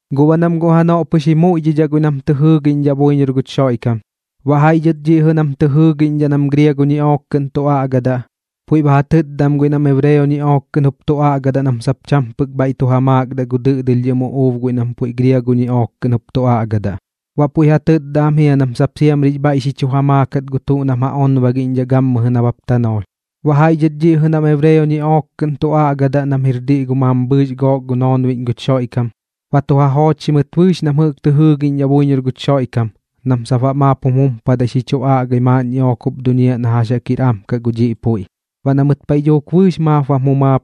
Guꞌ baꞌ nam guꞌ janoꞌ pɨx ji muiꞌdhidhaꞌ guiꞌ nam tɨ jɨɨꞌñdhidhaꞌ buiñor guch Xoiꞌkam, baꞌ jaiꞌ dhɨt dhiꞌ jɨꞌ nam ba tɨ jɨɨgiꞌñdhaꞌ nam griago ñiꞌook kɨꞌn tu aꞌgadaꞌ, puiꞌ ba ja tɨtda am guiꞌ nam ebreo ñiꞌook kɨꞌn jup tu aꞌgadaꞌ nam sap cham pɨk bhaiꞌ tu ja maakdaꞌ gu dɨꞌdɨlhdhɨm uꞌuub guiꞌ nam puiꞌ griago kɨꞌn jup tu aꞌgadaꞌ. Baꞌ puiꞌ ja tɨtda am jia nam sap siamri jix bhaiꞌ xi chu ja maakat gu tuꞌ nam ja onbagiꞌñdhaꞌ gammɨjɨ nabap tanoolh. Baꞌ jaiꞌ dhɨt dhiꞌ jɨꞌ nam ebreo ñiꞌook kɨꞌn tu aꞌgadaꞌ nam jir diꞌ gu mambhɨɨx daman gook noonbiꞌñ guch Xoiꞌkam, baꞌ tu ja joochxi mɨt bɨɨx nam jɨꞌk tɨ jɨɨgiꞌñdhaꞌ buiñor guch Xoiꞌkam nam sap baꞌ maap jum jumpadai xi chu aꞌgai maaꞌn ñiꞌook jup duñiaꞌ na jax jaꞌk jir am kaꞌ gu dhiꞌ puiꞌ. Baꞌ na mɨt paiꞌ dhuuk bɨɨx maap bam jumaap,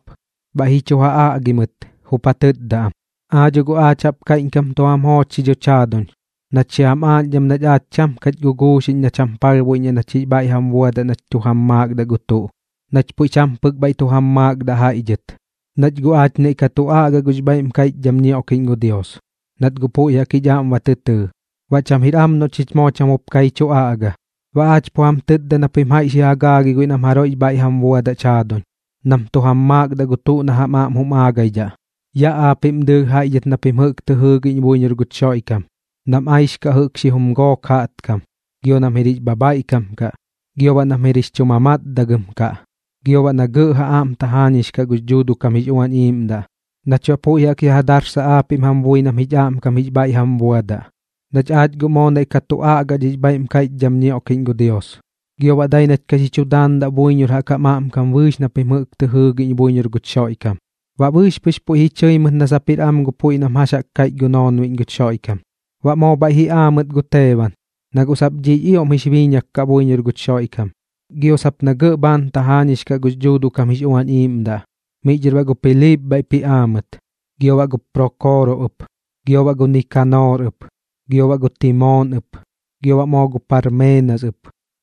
bhaiꞌ ji chu ja aꞌgi mɨt, jup ja tɨtda am: ―Aa dho guꞌ aach jaꞌp kaiꞌñkam tu jam joochxi dhoch jaaduñ nach xi jam aaꞌñdham nach aach cham kach guꞌnguxiꞌñ nach jam palhbuiꞌñdhaꞌ nach jix bhaiꞌ jam buadaꞌ nach tu jam maakdaꞌ gu tuꞌ, nach puiꞌ cham pɨk bhaiꞌ tu jam maakdaꞌ jaiꞌ dhɨt, nach guꞌ aach naiꞌ ka tu aꞌga gux bhaiꞌm kaiꞌchdham ñioꞌkiꞌñ gu Dios, nat guꞌ puiꞌ jaꞌk jich aꞌm ba tɨ tɨɨ. Baꞌ cham jir am noꞌ chich moo cham jup ka ji chu aꞌga. Baꞌ aach pu jam tɨtda na pim jaiꞌ xi ja gaagai guiꞌ nam jaroiꞌx bhaiꞌ jam buadaꞌch jaaduñ, nam tu jam maakdaꞌ gu tuꞌ na jam aꞌm jum aagaidhaꞌ, yaꞌ aapiꞌm dɨɨlh jaiꞌ dhɨt na pim jɨꞌk tɨ jɨɨgiꞌñ buiñor guch Xoiꞌkam, nam aixkaꞌ jɨꞌk xi jum gook jaꞌtkam, gio nam jir jix bhabhaiꞌkam kaꞌ, gio baꞌ nam jir jix chu mamatdagɨm kaꞌ, gio baꞌ na gɇꞌ ja aꞌm tajaañix kaꞌ gux Dhuuduꞌ kam jix Uañ Iiꞌmdaꞌ, nach baꞌ puiꞌ jaꞌk ya ja darsaꞌ aapiꞌm jam bui nam jich aꞌmkam jix bhaiꞌ jam buadaꞌ, nach aach guꞌ moo naiꞌ ka tu aꞌga gux bhaiꞌm kaiꞌchdham ñioꞌkiꞌñ gu Dios, gio baꞌ dai nach ka xi chu daandaꞌ buiñor jaꞌk jam aꞌmkam bɨɨx na pim jɨꞌk tɨ jɨɨgiꞌñ buiñor guch Xoiꞌkam. Baꞌ bɨɨx pɨx puiꞌ ji chɨi mɨt na sap jir am gu puiꞌ nam jax kaiꞌch gu noonbiꞌñ guch Xoiꞌkam. Baꞌ moo bhaiꞌ ji aa mɨt gu Teeban, na guꞌ sap dhiꞌx ioꞌm jix biiñak kaꞌ buiñor guch Xoiꞌkam, gio sap na gɇꞌ bhaan tajaañix kaꞌ gux Dhuuduꞌ kam jix Uañ Iiꞌmdaꞌ. Miꞌ dhɨr baꞌ gu Piliip bhaiꞌp ji aa mɨt, gio baꞌ gu Prookoro ɨp, gio baꞌ gu Nikanoor ɨp, gio baꞌ gu Timoon ɨp, gio baꞌ moo gu Parmeenas ɨp,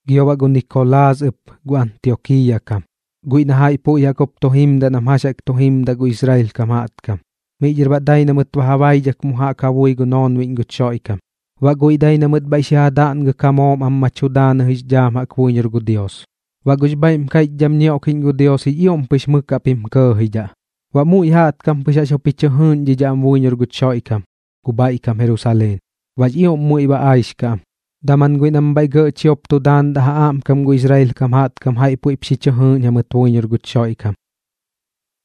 gio baꞌ Nikolaas ɨp gu Antiokiiya kam, guiꞌ na jaiꞌ puiꞌ jaꞌk jup tu jimdaꞌ nam jax jaꞌk tu jimdaꞌ gu Israel kam jaꞌtkam. Miꞌ dhɨr baꞌ dai na mɨt ba ja baidhak mu jaꞌk ja bui gu noonbiꞌñ guch Xoiꞌkam, baꞌ guiꞌ dai na mɨt bhaiꞌ xi ja daꞌngɨk ja moom am ma tu daanɨ jix dhaam jaꞌk buiñor gu Dios. Baꞌ gux bhaiꞌm kaiꞌchdham ñioꞌkiꞌñ gu Dios jix ioꞌm pɨx mɨk jaꞌp jim kɇɇjidhaꞌ. Baꞌ muiꞌ jaꞌtkam pɨx jaꞌx jup ji chɨ jɨɨꞌñdhidhaꞌ am buiñor guch Xoiꞌkam gu bhaiꞌ kam Jerusaleen, baꞌx ioꞌm muiꞌ ba aixkaꞌ am. Daman guiꞌ nam bhaiꞌ gɇꞌ chiop tu daandaꞌ ja aꞌmkam gu Israel kam jaꞌtkam jaiꞌ puiꞌp xi chɨ jɨɨꞌñ jamɨt buiñor guch Xoiꞌkam.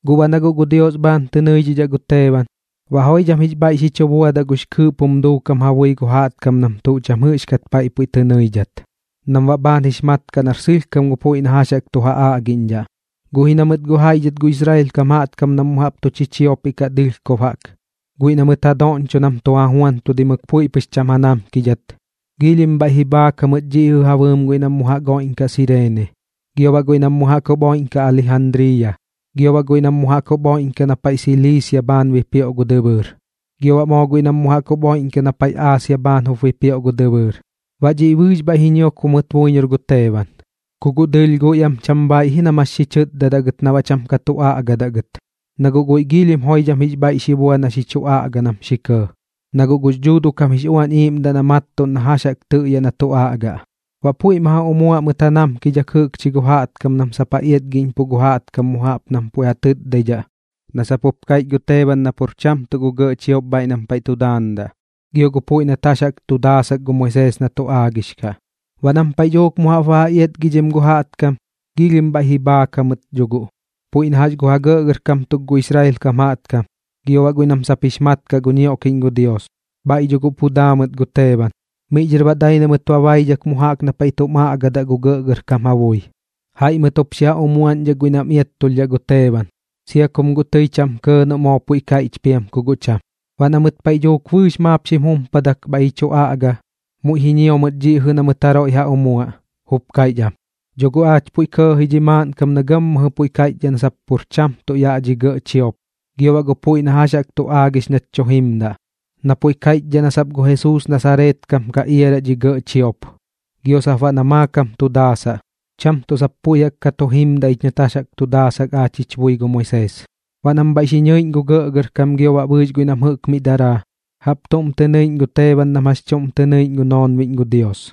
Guꞌ baꞌ na guꞌ gu Dios bhaan tɨ nɨiꞌñdhaꞌ gu Teeban, baꞌ joidham jix bhaiꞌ xi chu buadaꞌ gux kɨɨꞌp jum duukam ja bui gu jaꞌtkam nam tuꞌ cham jɨꞌxkat paiꞌ puiꞌ tɨ nɨidhat, nam baꞌ bhaan jix mat kaꞌ nar sɨlhkam gu puiꞌ na jax jaꞌk tu ja aꞌgiꞌñdhaꞌ. Guꞌ ji na mɨt guꞌ jaiꞌ dhɨt gu Israel kam jaꞌtkam nam mu jaꞌp tu chiopiꞌ kaꞌ dɨlhkob jaꞌk, guiꞌ na mɨt ja doꞌñcho nam tu ja juantudimɨk puiꞌ pɨx cham ja namkidhat, giilhim bhaiꞌ ji bhaak jamɨt dhiꞌ jɨꞌ ja bɨɨm guiꞌ nam mu jaꞌk oiꞌñkaꞌ Sireene, gio baꞌ guiꞌ nam mu jaꞌk jup oiꞌñkaꞌ Alijandriiya, gio baꞌ jaiꞌ guiꞌ nam mu jaꞌk jup oiꞌñkaꞌ na paiꞌ Siliisia bhaan bipioꞌ gu dɨbɨɨr, gio baꞌ moo guiꞌ nam mu jaꞌk jup oiꞌñkaꞌ na paiꞌ Aasia bhaan jup bipioꞌ gu dɨbɨɨr. Baꞌ dhiꞌ bɨɨx bhaiꞌ ji ñiokbo mɨt buiñor gu Teeban. Ku guꞌ dɨɨlh guiꞌ am cham bhaaiꞌ ji nam jax jaꞌk xi chɨtdadaꞌ gɨt na baꞌ cham ka tu aꞌgadaꞌ gɨt, na guꞌ guiꞌ giilhim joidham jix bhaiꞌ xi bua na xi chu aꞌga nam xi kɇɇ, na guꞌ gux Dhuuduꞌ kam jix Uañ Iiꞌmdaꞌ na mattuꞌn na jax jaꞌk tɨꞌyaꞌ na tu aꞌgaꞌ. Baꞌ puiꞌ ma ja umuaꞌ mɨt ja namkidhak jɨꞌkchi gu jaꞌtkam nam sap ja iatgiꞌñpuꞌ gu jaꞌtkam mu jaꞌp nam puiꞌ ja tɨtdaidhaꞌ, na sap puiꞌ kaiꞌch gu Teeban na pur cham tuꞌ gu gɇꞌ chiop bhaiꞌ nam paiꞌ tu daandaꞌ gio gu puiꞌ nat jax jaꞌk tu daasak gu Moisees na tu aagix kaꞌ. Baꞌ nam paiꞌ dhuuk mu jaꞌp ba ja iatgidhim gu jaꞌtkam, giilhim bhaiꞌ ji bhaak jamɨt dho guꞌ, puiꞌ na jax gu ja gɇꞌgɇrkam tuk gu Israel kam jaꞌtkam, gio baꞌ guiꞌ nam sap jix mat kaꞌ gu ñioꞌkiꞌñ gu Dios. Bhaiꞌ dho guꞌ pu daa mɨt gu Teeban, miꞌ dhɨr baꞌ dai na mɨt ba baidhak mu jaꞌk na paiꞌ tum aꞌgadaꞌ gu gɇꞌgɇrkam ja bui. Jaiꞌ mɨt jup xi ja umuaꞌñdhak guiꞌ nam iattulhdhaꞌ gu Teeban, sia kum guꞌ tɨi cham kɇɇ noꞌ moo puiꞌ kaiꞌch piam ku guꞌ cham. Baꞌ na mɨt paiꞌ dhuuk bɨɨx maap xim jumpadak bhaiꞌ ji chu aꞌga, muiꞌ ji ñio mɨt dhiꞌ jɨꞌ na mɨt jaroiꞌ ja umuaꞌ, jup kaiꞌch am: ―Dho guꞌ aach puiꞌ kɇɇkɇꞌ ji dhi maaꞌnkam na gammɨjɨ puiꞌ kaiꞌchdhaꞌ na sap pur cham tuꞌ yaꞌ dhi gɇꞌ chiop gio baꞌ gu puiꞌ na jax jaꞌk tu aagix nach tu jimdaꞌ, na puiꞌ kaiꞌchdhaꞌ na sap gu Jesuus Nasareet kam ka iaraꞌ dhi gɇꞌ chiop, gio sap baꞌ na maakam tu daasaꞌ, cham tuꞌ sap puiꞌ jaꞌk ka tu jimdaꞌ ich nat jax jaꞌk tu daasak aach jich bui gu Moisees. Baꞌ nam bhaiꞌ xi ñɨiꞌñ gu gɇꞌgɇrkam gio baꞌ bɨɨx guiꞌ nam jɨꞌk miꞌ daraa, jaꞌp tuꞌm tɨ nɨiꞌñ gu Teeban nam jax chuꞌm tɨ nɨiꞌñ gu noonbiꞌñ gu Dios.